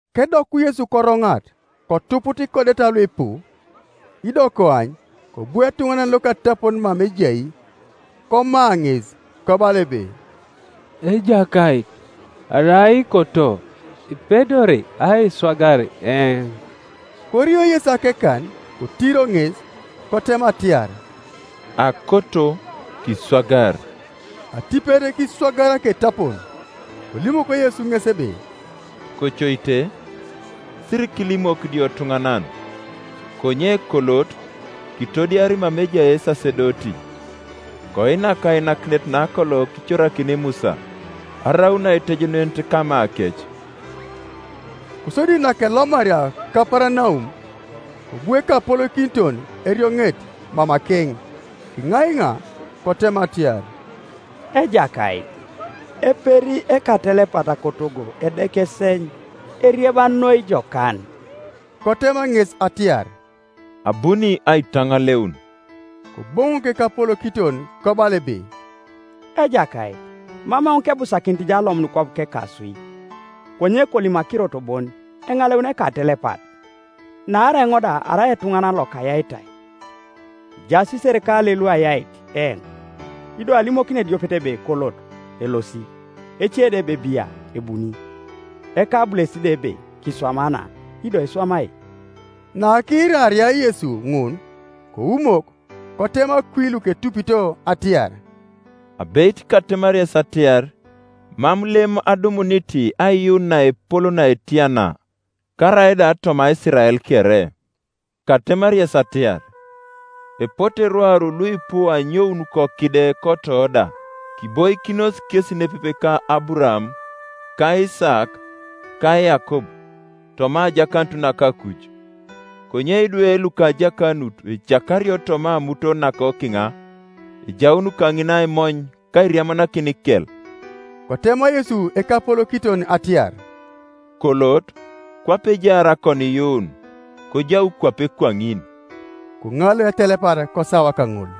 Kedoku Yesu koroŋat, kotuput ikodeta luipu. Ido koany, kobu etuŋanan lokatapon mama ejai, koma ŋes, kobala ebe, “Ejakait, arai ikoto, ipedori aiswagar eoŋ.” Korio Yesu akekan, kotiro ŋes, kotema atiar, “Akoto; kiswagar.” Atipet kiswagar aketapon. Kolimok Yesu ŋes ebe, “Kocoite, sirikilimok idiotuŋanan; konye kolot, kitodiar mama ejai esasedoti, koinak ainakinet nakolo kicorakini Musa, araun aitejenunet kamakec.” Kosodi nakelomaria Kaparanaum, kobu ekapolokiton erioŋet mamakeŋ, kiŋaiŋa, kotema atiar, “Ejakait, eperi ekatelepat kotogo edeka eseny, erieba noi jokan.” Kotema ŋes atiar, “Abuni aitaŋaleun.” Koboŋok ekapolokiton kobala ebe, “Ejakait, mam eoŋ kebusakinit jo alomun kwap kekaswi; konye kolim akirot bon, eŋaleuni ekatelepat. Naarai eoŋ da arai etuŋanan lokayaitai, ejaas iserikalei luayait eoŋ: ido alimokini ediopet ebe, ‘Kolot,’ elosi; ece da ebe, ‘Bia,’ ebuni; ekabulesit da ebe, ‘Kiswama na,’ ido iswamai.” Nakiiraria Yesu ŋun, koumok, kotema kwi luketupito atiar, “Abeit katemari yes atiar, Mam lem adumunit aiyuun naepol naetia na, karaida toma Isirael kere. Katemari yes atiar, Epote rwaru luipu anyoun kokide koto da, kiboikinos kesi nepepe ka Aburaam, ka Isaak, ka Yakob, toma ajakanut naka akuj. Konye idwe luka ajakanut ecakario toma amuton nakokiŋa: ejaun kaŋina aimony ka airiamanakin ikel.” Kotema Yesu ekapolokiton atiar, “Kolot, kwape ejaar akoniiyuun, kojau kwape kwaŋin.” Koŋaleu etelepat kosawa kaŋol.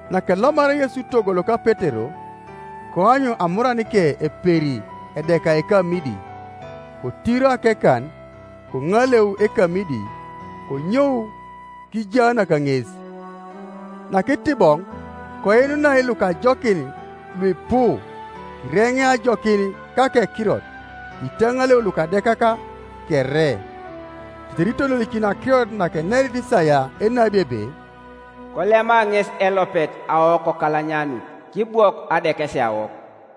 Nakelomaria Yesu togo loka Petero, koany amuranike eperi edeka ekamidi. Kotiro akekan, koŋaleu ekamidi; konyou kijaanak ŋes. Nakitiboŋ, koinunai lukajokin luipu: kireŋea ajokin kakekirot, kitaŋaleu lukadekak kere. Tetere itololikinio akirot naenerit Isaia enabi ebe, “Kolema ŋesi elopet awokokalanyanut, kibwok adekesiawok.”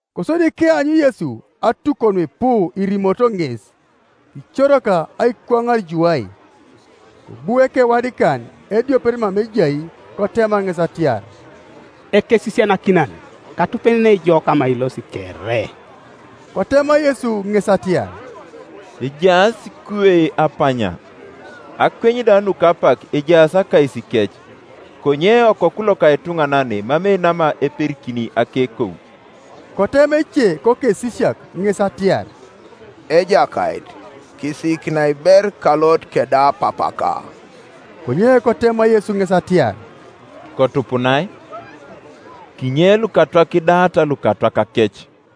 Kosodi keanyu Yesu atukon nuipu irimorito ŋes, kicorak aikwaŋar juwai. Kobu ekewadikan ediopet mama ejai, kotema ŋes atiar, “Ekesisianakinan, katupenenei jo kama ilosi kere.” Kotema Yesu ŋes atiar, “Ejaas ikuwei apanya, akweny da nuka apak ejaas akaisikec; konye Okoku loka etuŋanan emamei nama iperikini akekou.” Kotema ece kokesisiak ŋes atiar, “Ejakait, kisiikinai ber kalot keda papaka.” Konye kotema Yesu ŋes atiar, “Kotupunai; kinye lukatwak kidaata lukatwakakec.”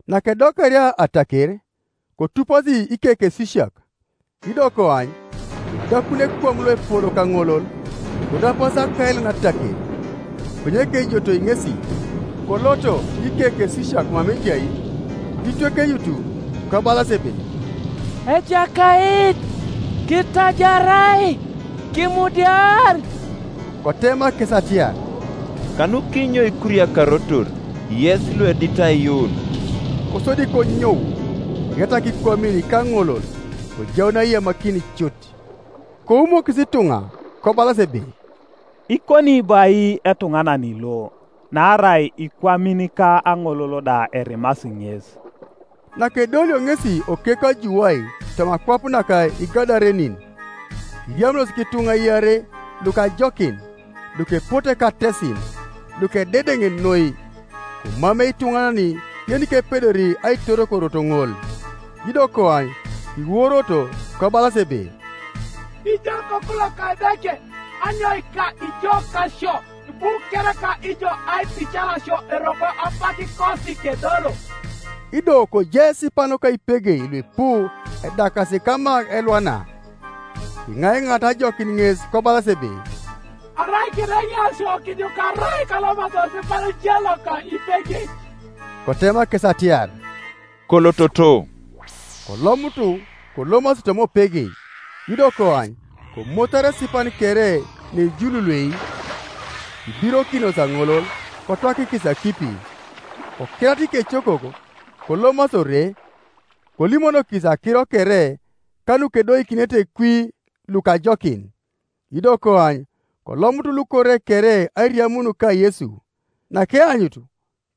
Nakedokaria ataker, kotupasi ikekesisiak. Ido koany, kodakun ekwam loepol kaŋolol, korapasi akailan ataker: konye kejotoi ŋesi. Koloto ikekesisiak mama ejai kitwekenyut, kobalas ebe, “Ejakait, kitajarai; kimudiar.” Kotema kes atiar, “Kanukinyo ikuriakarotor, yes luedit aiyuun?” Kosodi konyou, kiretak ikwamin ka aŋolol; kojaun aiyamakin cut, Koumokis ituŋa, kobalas ebe, “Ikoni bo ai etuŋanan lo? Naarai ikwamin ka aŋolol da erimasi ŋes.” Nakedolio ŋesi okekwa juwai toma akwap naka Igadarenin, kiriamunos kituŋa iarei lukajokin, lukepote katesin, lukededeŋ noi, komamei ituŋanan yenikepedori aitor korot kaŋol. Ido koany, kiworoto, kobalas ebe, “Ijo Okoku loka Edeke, anyoika ijo kasio? Ibu kereka ijo aitican sio eroko apakikosi kedolo?” Ido kojai esipan loka ipegei luipu edakasi kama elwana. Kiŋaiŋaata ajokin ŋes kobalas ebe, “Arai kiireŋea sio, kijukarai kalomasi osipan je loka ipegei.” Kotema kes atiar, “Kolototo.” Kolomutu kolomasi toma opegei; ido koany, komotar esipan kere nejululuei kibirokinos aŋolol, kotwakikis akipi. Kokerata ikecokok, kolomasi ore, kolimonokis akiro kere, ka nukedoikinete kwi lukajokin. Ido koany, kolomut lukore kere airiamun ka Yesu: nakeanyut,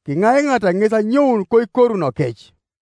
kiŋaiŋaata ŋes anyoun koikorunokec.